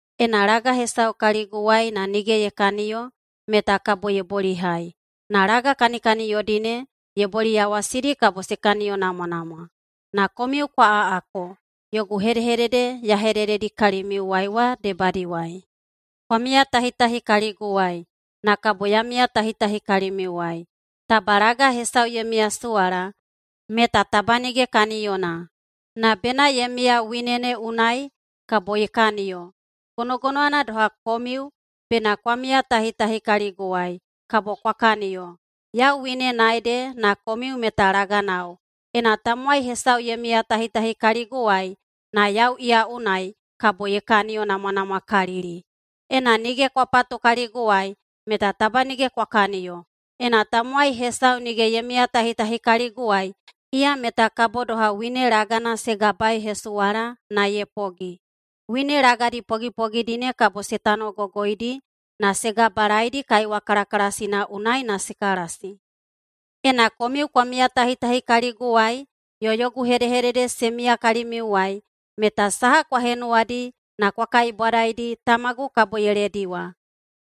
Ena laga hesau kaliguwai na nige ye kaniyo meta kabo ye bolihai. Na laga kanikaniyodi ne ye boliyawasidi kabo se kaniyonamwanamwa. Na komiu kwa aꞌako yogu hedehedede ya hedededi kalimiuwai wa debadiwai. Kwa miyatahitahi kaliguwai, na kabo ya miyatahitahi kalimiuwai. Taba laga hesau ye miyasuwala, meta taba nige kaniyona. Na bena ye miya wine ne unai, kabo ye kaniyo. Gonogonowana doha komiu bena kwa miyatahitahi kaliguwai, kabo kwa kaniyo. Yau winena ede na komiu meta laganao. Ena tamowai hesau ye miyatahitahi kaliguwai na yau iya unai, kabo ye kaniyo namwanamwakalili. Ena nige kwa patu kaliguwai, meta taba nige kwa kaniyo. Ena tamowai hesau nige ye miyatahitahi kaliguwai, iya meta kabo doha wine lagana se gabaeihesuwala na ye pogi. Wine lagadi pogipogidi ne kabo se tanogogoidi na se gabalaedi kaiwa kalakalasina unai na se kalasi. Ena komiu kwa miyatahitahi kaliguwai yo yogu hedehedede se miya kalimiuwai, meta saha kwa henuwadi na kwa kaibwadaidi, Tamagu kabo ye lediwa.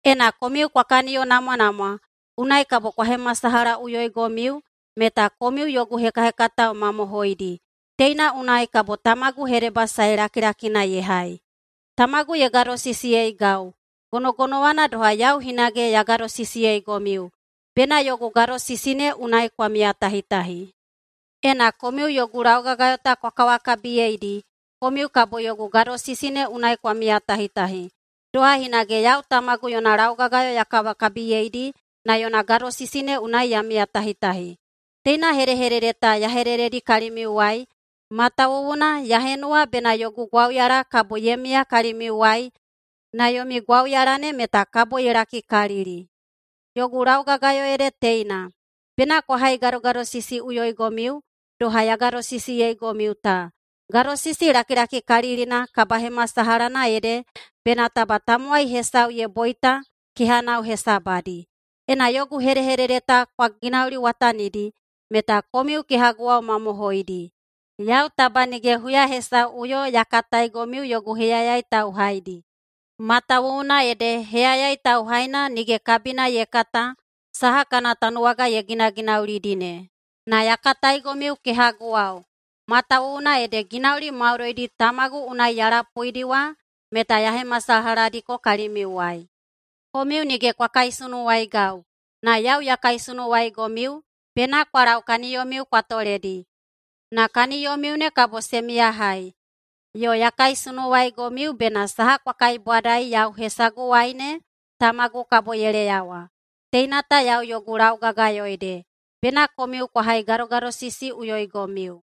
Ena komiu kwa kaniyonamwanamwa, unai kabo kwa hemasalahaꞌuyoigomiu meta komiu yogu hekahekatao mamohoidi. Teina unai kabo Tamagu hedebasae lakilakina ye hai. Tamagu ye gadosisiyeigau, gonogonowana doha yau hinage ya gadosisiyeigomiu. Bena yogu gadosisi ne unai kwa miyatahitahi. Ena komiu yogu laugagayo ta kwa kawakabiyeidi, komiu kabo yogu gadosisi ne unai kwa miyatahitahi, doha hinage yau Tamagu yona laugagayo ya kawakabiyeidi na yona gadosisi ne unai ya miyatahitahi. Teina hedehedede ta ya hedededi kalimiuwai matawuwuna ya henuwa bena yogu gwauyala kabo ye miya kalimiuwai na yomi gwauyala ne meta kabo ye lakikalili. Yogu laugagayo ede teina: Bena kwa haigadogadosisiꞌuyoigomiu doha ya gadosisiyeigomiu ta. Gadosisi lakilakikalilina kabahemasalahana ede bena taba tamowai hesau ye boita kehanao hesabadi. Ena yogu hedehedede ta kwa ginauliwatanidi, meta komiu kehaguwao mamohoidi. Yau taba nige huya hesauꞌuyo ya kataigomiu yogu heyayai tauhaidi, matawuwuna ede heyayai tauhaina nige kabina ye kata saha kana tanuwaga ye ginaginaulidi ne. Na ya kataigomiu kehaguwao, matawuwuna ede ginauli maudoidi Tamagu unai ya lapuidi wa meta ya hemasalahadiko kalimiuwai. Komiu nige kwa kaisunuwaigau, na yau ya kaisunuwaigomiu, bena kwa lau kaniyomiu kwa toledi, na kaniyomiu ne kabo se miyahai. Yo ya kaisunuwaigomiu bena saha kwa kaibwadai yau hesaguwai ne, Tamagu kabo ye leyawa. Teina ta yau yogu laugagayo ede: Bena komiu kwa haigadogadosisiꞌuyoigomiu.”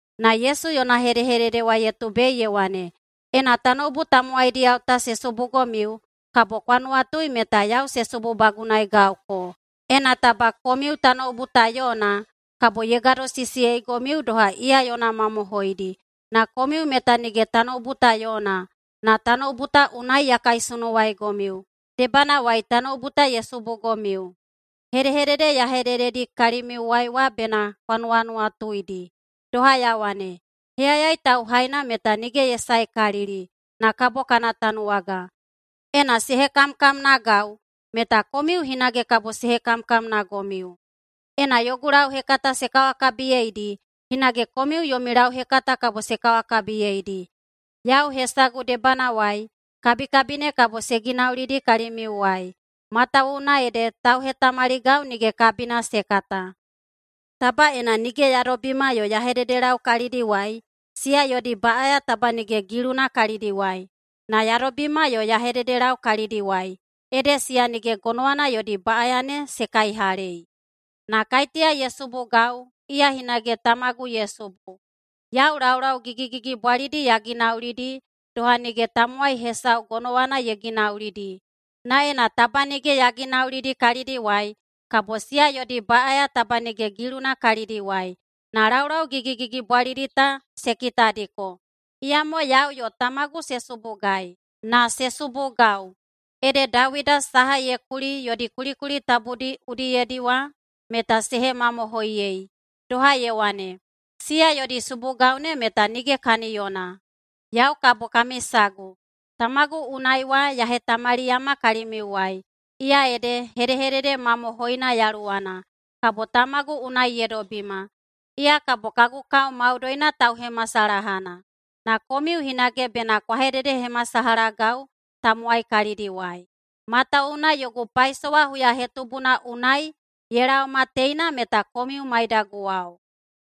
[Na Yesu yona hedehedede wa ye tubei ye wane,] “Ena tanoubu tamowaidiyao ta se subugomiu, kabo kwa nuwatui meta yau se sububagunaegauko. Ena taba komiu tanoubu ta yona, kabo ye gadosisiyeigomiu doha iya yona mamohoidi. Na komiu meta nige tanoubu ta yona, na tanoubu ta unai ya kaisunuwaigomiu. Debanawai tanoubu ta ye subugomiu. Hedehedede ya hedededi kalimiuwai wa bena kwa nuwanuwatuidi, doha ya wane, ‘Heyayai tauhaina meta nige ye saekalili na kabo kana tanuwaga.’ Ena se hekamkamnagau, meta komiu hinage kabo se hekamkamnagomiu. Ena yogu lauhekata se kawakabiyeidi, hinage komiu yomi lauhekata kabo se kawakabiyeidi. Yau hesagu debanawai kabikabi ne kabo se ginaulidi kalimiuwai, matawuwuna ede tauhetamaligau nige kabina se kata. Taba ena nige ya dobima yo ya hededelau kalidiwai, siya yodi baꞌaya taba nige giluna kalidiwai. Na ya dobima yo ya hededelau kalidiwai, ede siya nige gonowana yodi baꞌaya ne se kaihalei. Na kaiteya ye subugau, iya hinage Tamagu ye subu. Yau laulau gigigigibwalidi ya ginaulidi doha nige tamowai hesau gonowana ye ginaulidi. Na ena taba nige ya ginaulidi kalidiwai, kabo siya yodi baꞌaya taba nige giluna kalidiwai. Na laulau gigigigibwalidi ta se kitadiko, iyamo yau yo Tamagu se subugai. Na se subugau, ede Dawida saha ye kuli yodi kulikuli tabudi udiyedi wa meta se hemamohoiyei, doha ye wane, ‘Siya yodi subugau ne meta nige kaniyona.’ Yau kabo kami sagu Tamagu unai wa ya hetamaliyama kalimiuwai. Iya ede hedehedede mamohoina Yaluwana, kabo Tamagu unai ye dobima. Iya kabo kagu kao maudoina tauhemasalahana. Na komiu hinage bena kwa hededehemasalahagau tamowai kalidiwai, matawuwuna yogu paisowa huyahetubuna unai ye laoma teina meta komiu maidaguwao.